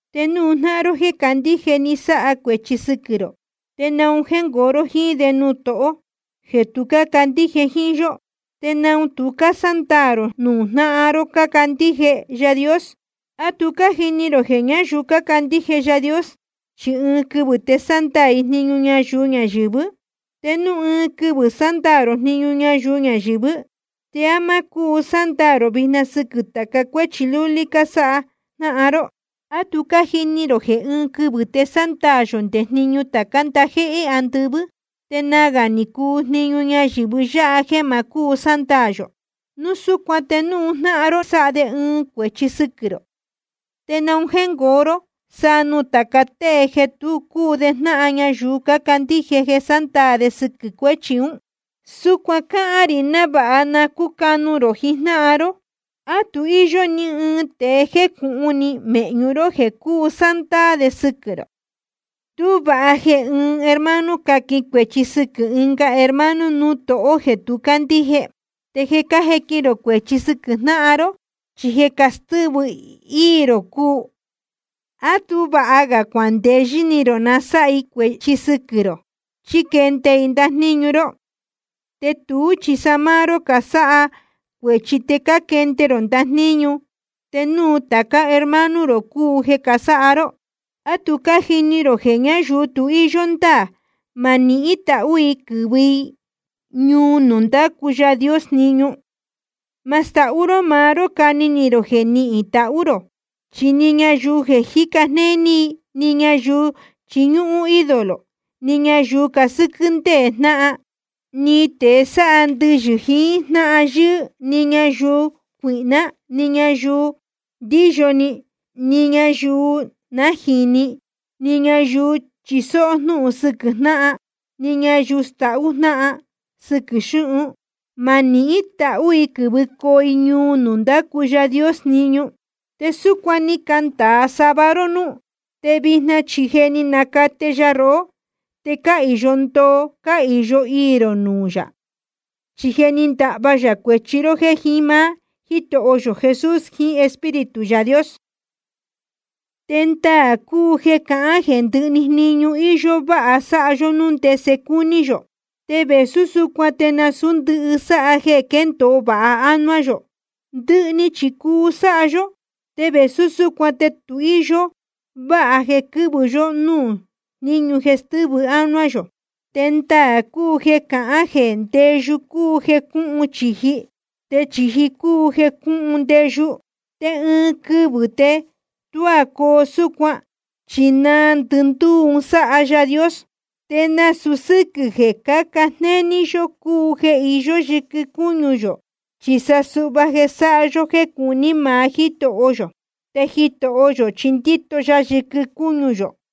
Te núu jnáhan ró jéē candíje ni sáha cuēchi sɨquɨ̄ rō, ¿te naun jéngoo ró jíín de nuū tohó jeē tu cácandíje jíín yó? ¿Te naun tu cásándaā rō nuū jnáhan ró cácandíje Yaā Dios? ¿A tu cájini rō jeē ñáyuu cácandíje Yaā Dios chi ɨɨn quɨvɨ̄ te sándaā i jniñu ñayuu ñayɨ̄vɨ́? Te núu ɨɨn quɨvɨ̄ sándaā rō jniñu ñayuu ñayɨ̄vɨ́, ¿te á má cúu sándaā rō vijna sɨquɨ̄ tāca cuéchi lúlí cásáha jnáhan ró? ¿A tu cájini rō jeē ɨɨn quɨvɨ̄ te sándaā yō nde jniñu tācá ndajéhé andɨvɨ́? Te nagā ni cuu jniñu ñayɨ̄vɨ yáha jeē ma cúu sándaā yō. Núu súcuan te núu jnáhan ró sáha de ɨɨn cuēchi sɨquɨ̄ rō, ¿te naun jéngoo ró sa nuū tāca tée jeē tu cúu de jnáhan ñayuu cácandíje jeē sándaā de sɨquɨ̄ cuéchi ún? Súcuan cáhán rī návāha na cúcanu rō jijnáhan ró. ¿A tu íyó ni ɨɨn tēe jécūhun ni mēhñu ró jeē cuu sándaā de sɨquɨ̄ rō? Tú vāha jeē ɨɨn hermano caquin cuēchi sɨquɨ̄ ɨnga hermano nuū tohó jeē tu cácandíje. Te jeē cájequin rō cuēchi sɨquɨ̄ jnáhan ró, chi jeē castɨ́vɨ íī rō cúu. ¿A tú vāha ga cuandeyɨ́ ni rō na sáha i cuēchi sɨquɨ̄ rō chí quende i ndajníñu ró? Te tuú chi sa máá ró cásáha cuēchi te cáquende ró ndajníñu, te nuū tācá hermano rō cúu jeē casáha ró. ¿A tu cájini rō jeē ñáyuu tu íyó ndáā, ma nihín tahú i quɨ̄vɨ i ñuu nuū ndácu Yaā Dios jniñu? Ma stahú ró maá ró cani ni rō jeē nihín tahú rō, chi ni ñayuu jeē jíca jnéní, ni ñayuu chiñúhún ídolo, ni ñayuu casɨ́quɨ́ ndéē jnáhan, ni tēe sáha ndɨyɨ̄ jiín jnáhan yɨ́ɨ́, ni ñayuu cuīhná, ni ñayuu ndíyo ni, ni ñayuu nájīni, ni ñayuu chisó jnúhun sɨquɨ̄ jnáhan, ni ñayuu stahú jnáhan sɨquɨ̄ xúhun, ma nihín tahú i quɨ̄vɨcoo i ñuu nuū ndácu Yaā Dios jniñu. Te súcuan ni candāa sava ró núú, te vijna chi je ni nacate ya rohó, te cáhīyo ndoo cáhīyo iī rō nuū yā. Chi je ni ndahva yā cuēchi ró jéē jiín máá Jítoho yō Jesús jiín Espíritu Yaā Dios. Te ndaā cúu jeē cácahān jeē ndɨhɨ‑ni jniñu íyó váha sáha yó núu ndese cúní yō. Te vēsú súcuan te nasūú ndɨhɨ sáha jeē quéndōo vāha ánuá yō. Ndɨhɨ chi cuu sáha yó, te vēsú súcuan te tu íyó váha jeē quɨ́vɨ yó núū jníñu jeē stɨ́vɨ ánuá yō. Te ndaā cúu jeē cácahān jeē ndeyu cúu jeē cúhun chīji, te chīji cúu jeē cúhun ndeyu. Te ɨɨn quɨvɨ̄ te tuá coo súcuan, chi naa ndɨndúú un sáha Yaā Dios. Te nasūu sɨ́quɨ̄ jeē cáca jnéní yó cúu jeē iyó yɨquɨ cúñu yō, chi sa suhva jeē sáha yó jéē cuní maá Jítoho yō. Te Jitoho yō chi ndíto ya yɨquɨ cúñu yō.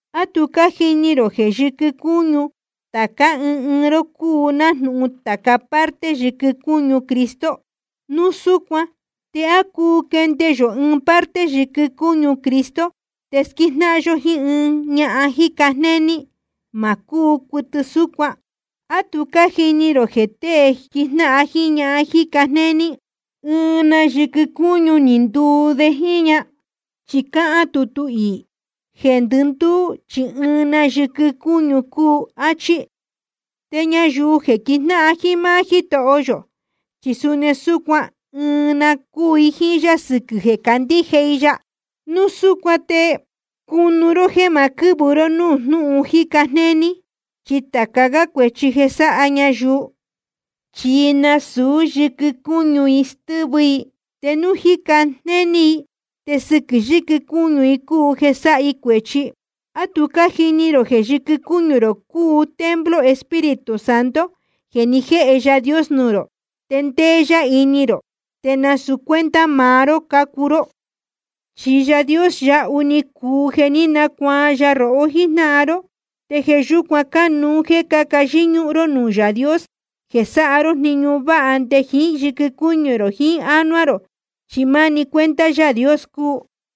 ¿A tu cájini rō jeē yɨ́quɨ cúñu tācá ɨɨn ɨɨn ró cúu nájnūhun tāca parte yɨquɨ cúñu Cristo? Núu súcuan ¿te á cuu quende yó ɨɨn parte yɨquɨ cúñu Cristo te squíjnáhan yó jíín ɨɨn ñahan jíca jnéní? Ma cúu cuɨtɨ súcuan. ¿A tu cájini rō jeē tēe quíjnáhan jiín ñahan jíca jnéní, ɨɨn na yɨquɨ cúñu ni nduu de jíín ña? Chi cáhán tutu iī: Jeē ndɨndúú chi ɨɨn na yɨquɨ cúñu cuu, áchí. Te ñayuu jeē quijnáhan jiín máá Jítoho yō, chi suni súcuan ɨɨn na cúu i jíín yá sɨquɨ̄ jeē candíje i ya. Núu súcuan te cunu ró jéē ma quɨ́vɨ ró núū jnúhun jíca jnéní. Chi tāca gá cuēchi jeē sáha ñayuu, chi nasūú yɨquɨ cúñu i stɨ́vɨ i. Te núu jíca jnéní i, te sɨquɨ̄ yɨquɨ cúñu i cúu jeē sáha i cuēchi. ¿A tu cájini rō jeē yɨquɨ cúñu rō cúu templo Espíritu Santo jeē ni jéhe Yaā Dios nuū rō, te ndéé yá ini rō? Te nasūu cuenta maá ró cácuu ró. Chi Yaā Dios yahu ni cuu jeē ní nacuaan ya rohó jíjnáhan ró. Te jeē yúcuan cánuú jéē cáca yɨ́ñúhún ró nuū Yaā Dios jeē sáha ró jniñu váha nde jiín yɨquɨ cúñu rō jiín ini jiín ánuá rō, chi máni cuenta Yaā Dios cúu.